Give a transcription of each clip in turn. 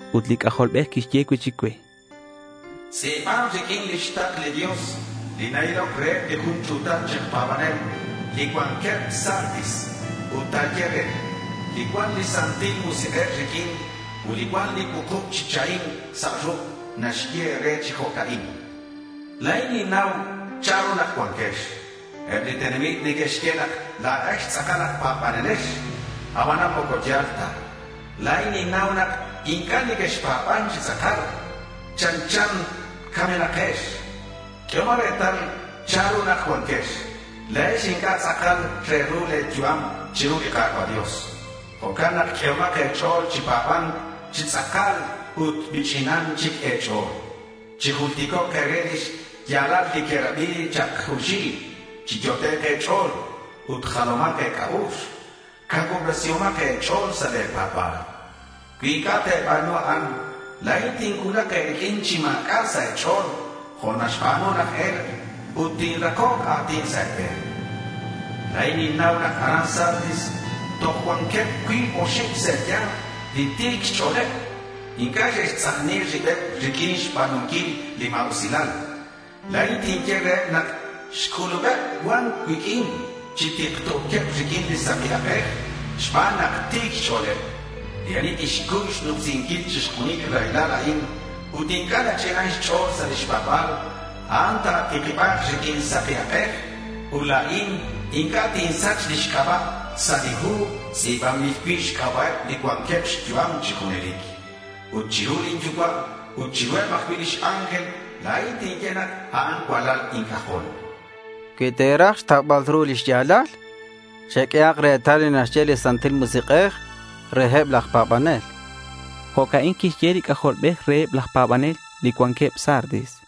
Ut li C'ajolbej quixye cui'chic cue: —Tz'i̱ban riq'uin lix takl li Dios li na-iloc reheb li jun ch'u̱tal chi aj pa̱banel li cuanqueb Sardis ut ta̱ye re: Li cuan li Santil Musik'ej riq'uin ut li cuan li cuukub chi chahim sa' ruk' naxye e̱re chi jo'ca'in: La̱in ninnau chanru nak cuanquex. Eb li tenamit neque'xye nak la̱ex tz'akal aj pa̱banelex. Abanan moco ya̱l ta. La̱in ninnau nak inc'a' nequexpa̱ban chi tz'akal. Chanchan camenakex. Q'uehomak retal chanru nak cuanquex. La̱ex inc'a' tz'akal re ru le̱ yu'am chiru li Ka̱cua' Dios. Jo'can nak q'uehomak e̱ch'o̱l chi pa̱ba̱nc chi tz'akal ut mich'inan chic e̱ch'o̱l. Chijulticok' e̱re li xya̱lal li querabi chak junxil. Chiyot'ek' e̱ch'o̱l ut jalomak e̱c'a'ux. Cacuubresihomak e̱ch'o̱l sa' le̱ pa̱ba̱l. Cui inc'a' te̱ba̱nu a'an, la̱in tincuulak e̱riq'uin chi ma̱c'a' sa' e̱ch'o̱l jo' naxba̱nu laj e̱lk' ut tinrakok a̱tin sa' e̱be̱n. La̱in ninnau nak aran Sardis toj cuanqueb cuib oxib sa' e̱ya̱nk li ti̱c xch'o̱leb. Inc'a' xe'xtz'ajni ribeb riq'uin xba̱nunquil li ma̱usilal. La̱in tinye reheb nak xc'ulubeb cua̱nc cuiq'uin chi tikto̱queb riq'uin saki ak'ej xban nak ti̱c xch'o̱leb. Li ani tixcuy xnumsinquil chixjunil li raylal a'in ut inc'a' nach'inan xch'o̱l sa' lix pa̱ba̱l, a'an ta̱tikiba̱k riq'uin saki ak'ej. Ut la̱in inc'a' tinsach lix c'aba' sa' li hu tz'i̱banbil cui' xc'aba'eb li cuanqueb xyu'am chi junelic. Ut chiru lin Yucua' ut chiruheb ajcui' lix ángel, la̱in tinye nak a'an cualal inc'ajol. Cui te̱raj xtaubal ru lix ya̱lal, cheq'uehak retal li naxye li Santil Musik'ej reheb laj pa̱banel. Jo'ca'in quixye li C'ajolbej reheb laj pa̱banel li cuanqueb Sardis.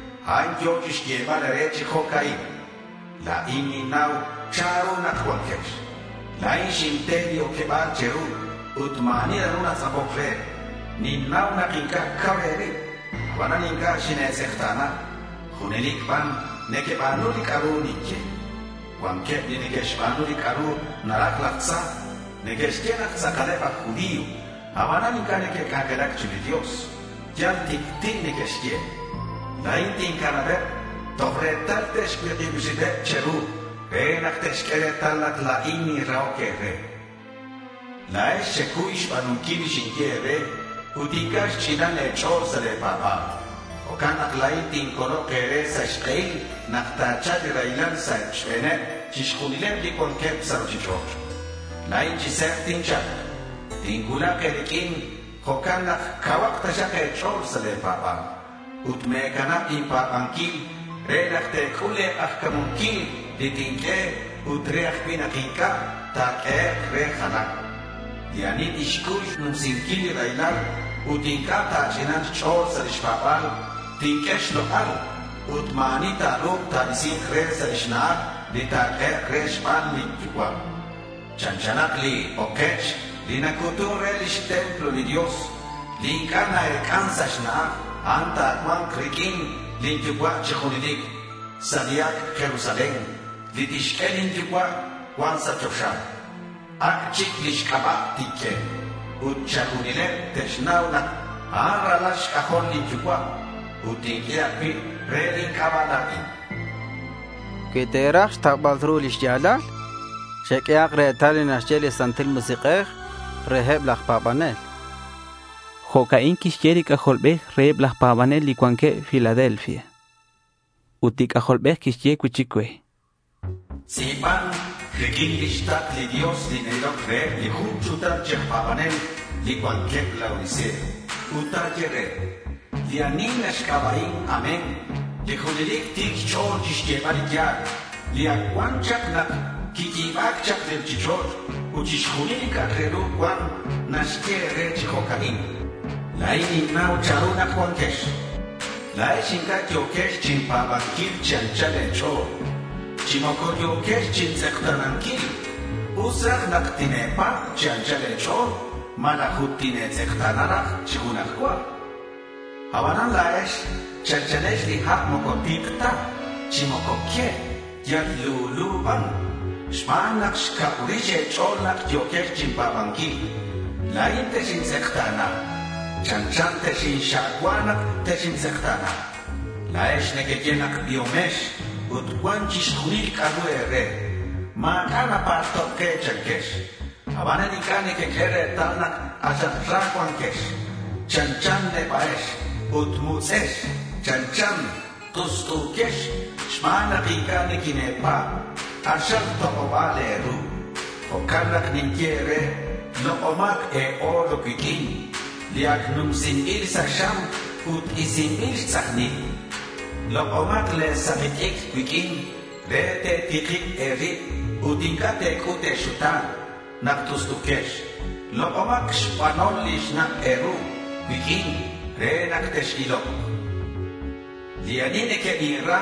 A'an yo̱ chixyebal e̱re chi jo'ca'in: La̱in ninnau chanru nak cuanquex. La̱in xinte li oqueba̱l che̱ru ut ma̱ ani naru ta̱tz'apok re. Ninnau nak inc'a' cau e̱rib. Abanan inc'a' xine̱tz'ekta̱na. Junelic ban nequeba̱nu li c'a'ru ninye. Cuanqueb li neque'xba̱nu li c'a'ru naraj laj tza. Neque'xye nak tz'akaleb aj judío, abanan inc'a' neque'c'anjelac chiru li Dios. Yal tic'ti' neque'xye. La̱in tincanabeb toj retal te'xcuik'ib ribeb che̱ru re nak te'xq'ue retal nak la̱in ninrahoc e̱re. La̱ex xecuy xba̱nunquil li xinye e̱re ut inc'a' xch'inan e̱ch'o̱l sa' le̱ pa̱ba̱l. Jo'can nak la̱in tincolok e̱re sa' xk'ehil nak ta̱cha̱lk li raylal sa' xbe̱neb chixjunileb li cuanqueb sa' ruchich'och'. La̱in chi se̱b tincha̱lk. Tincuulak e̱riq'uin. Jo'can nak cauhak taxak e̱ch'o̱l sa' le̱ pa̱ba̱l ut me̱canab inpa̱banquil re nak te̱c'ul le̱ k'ajca̱munquil li tinq'ue ut re ajcui' nak inc'a' ta̱q'uehek' re jalan. Li ani tixcuy xnumsinquil li raylal ut inc'a' ta̱ch'ina̱nk xch'o̱l sa' lix pa̱ba̱l, tinq'ue xlok'al ut ma̱ ani ta̱ru̱k ta̱isi̱nk re sa' lix na'aj li ta̱q'uehek' re xban lin Yucua'. Chanchanak li okech li nacu̱tun re lix templo li Dios, li inc'a' na-ec'an sa' xna'aj. A'an ta̱cua̱nk riq'uin lin Yucua' chi junelic sa' li Ac' Jerusalén li tixq'ue lin Yucua' cuan sa' choxa. Ac' chic lix c'aba' tinq'ue. Ut chixjunileb te'xnau nak a'an ralal xc'ajol lin Yucua'. Ut tinq'ue ajcui' re lin c'aba' la̱in. Cui te̱raj xtaubal ru li xya̱lal, cherabihak li naxye li Santil Musik'ej reheb laj pa̱banel. Jo'ca'in quixye li C'ajolbej reheb laj pa̱banel li cuanqueb Filadelfia. Ut li C'ajolbej quixye cui'chic cue: —Tz'i̱ban riq'uin lix takl li Dios li na-iloc reheb li jun ch'u̱tal chi aj pa̱banel li cuanqueb Laodicea ut ta̱ye re: Li ani naxc'aba'in “Amén”, li junelic ti̱c xch'o̱l chixyebal li ya̱l, li ac cuan chak nak quiyi̱ba̱c chak li ruchich'och' ut chixjunil li c'a'ak re ru cuan, naxye e̱re chi jo'ca'in: La̱in ninnau chanru nak cuanquex. La̱ex inc'a' yo̱quex chinpa̱banquil chi anchal e̱ch'o̱l, chi moco yo̱quex chintz'ekta̱nanquil. Us raj nak tine̱pa̱b chi anchal e̱ch'o̱l malaj ut tine̱tz'ekta̱na raj chi junaj cua. Abanan la̱ex chanchanex li ha' moco tik ta, chi moco que. Yal lulu ban. Xban nak xcab rix e̱ch'o̱l nak yo̱quex chinpa̱banquil, la̱in texintz'ekta̱na. Chanchan texinxa'cua nak texintz'ekta̱na. La̱ex nequeye nak biomex ut cuan chixjunil li c'a'ru e̱re. Ma̱c'a' napalto' ke chanquex. Abanan inc'a' nequeq'ue retal nak k'axal ra cuanquex. Chanchan neba'ex ut mutz'ex. Chanchan t'ust'uquex xban nak inc'a' niquine̱pa̱b. K'axal tok'oba̱l e̱ru. Jo'can nak ninye e̱re: Lok'omak e̱-oro cuiq'uin li ac numsinbil sa' xam ut isinbil xtz'ajnil. Lok'omak le̱ saki t'icr cuiq'uin re te̱tikib e̱rib ut inc'a' te̱c'ut e̱xuta̱n nak t'ust'u̱quex. Lok'omak xbanol li xnak' e̱ru cuiq'uin re nak tex-ilok. Li ani nequebinra,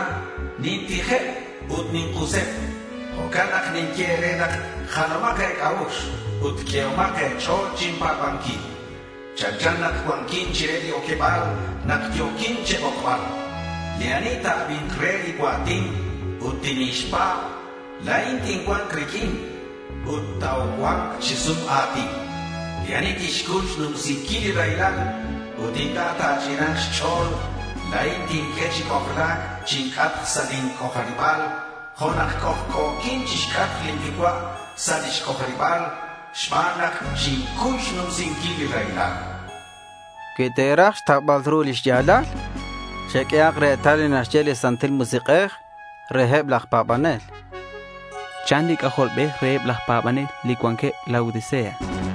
nintijeb ut nink'useb. Jo'can nak ninye e̱re nak jalomak e̱c'a'ux ut q'uehomak e̱ch'o̱l chinpa̱banquil. Chanchan nak cuanquin chire li oqueba̱l nak yo̱quin che̱bokbal. Li ani ta̱abi̱nk re li cua̱tin ut tinixpa̱b, la̱in tincua̱nk riq'uin ut tocua̱nk chi sum a̱tin. Li ani tixcuy xnumsinquil li raylal ut inc'a' ta̱ch'ina̱nk xch'o̱l, la̱in tinq'ue chi c'ojla̱c chinc'atk sa' lin c'ojariba̱l jo' nak c'ojc'o̱quin chixc'atk lin Yucua' sa' lix c'ojariba̱l xban nak xincuy xnumsinquil li raylal. Cui te̱raj xtaubal ru li xya̱lal, cheq'uehak retal li naxye li Santil Musik'ej reheb laj pa̱banel, chan li C'ajolbej reheb laj pa̱banel li cuanqueb Laodicea.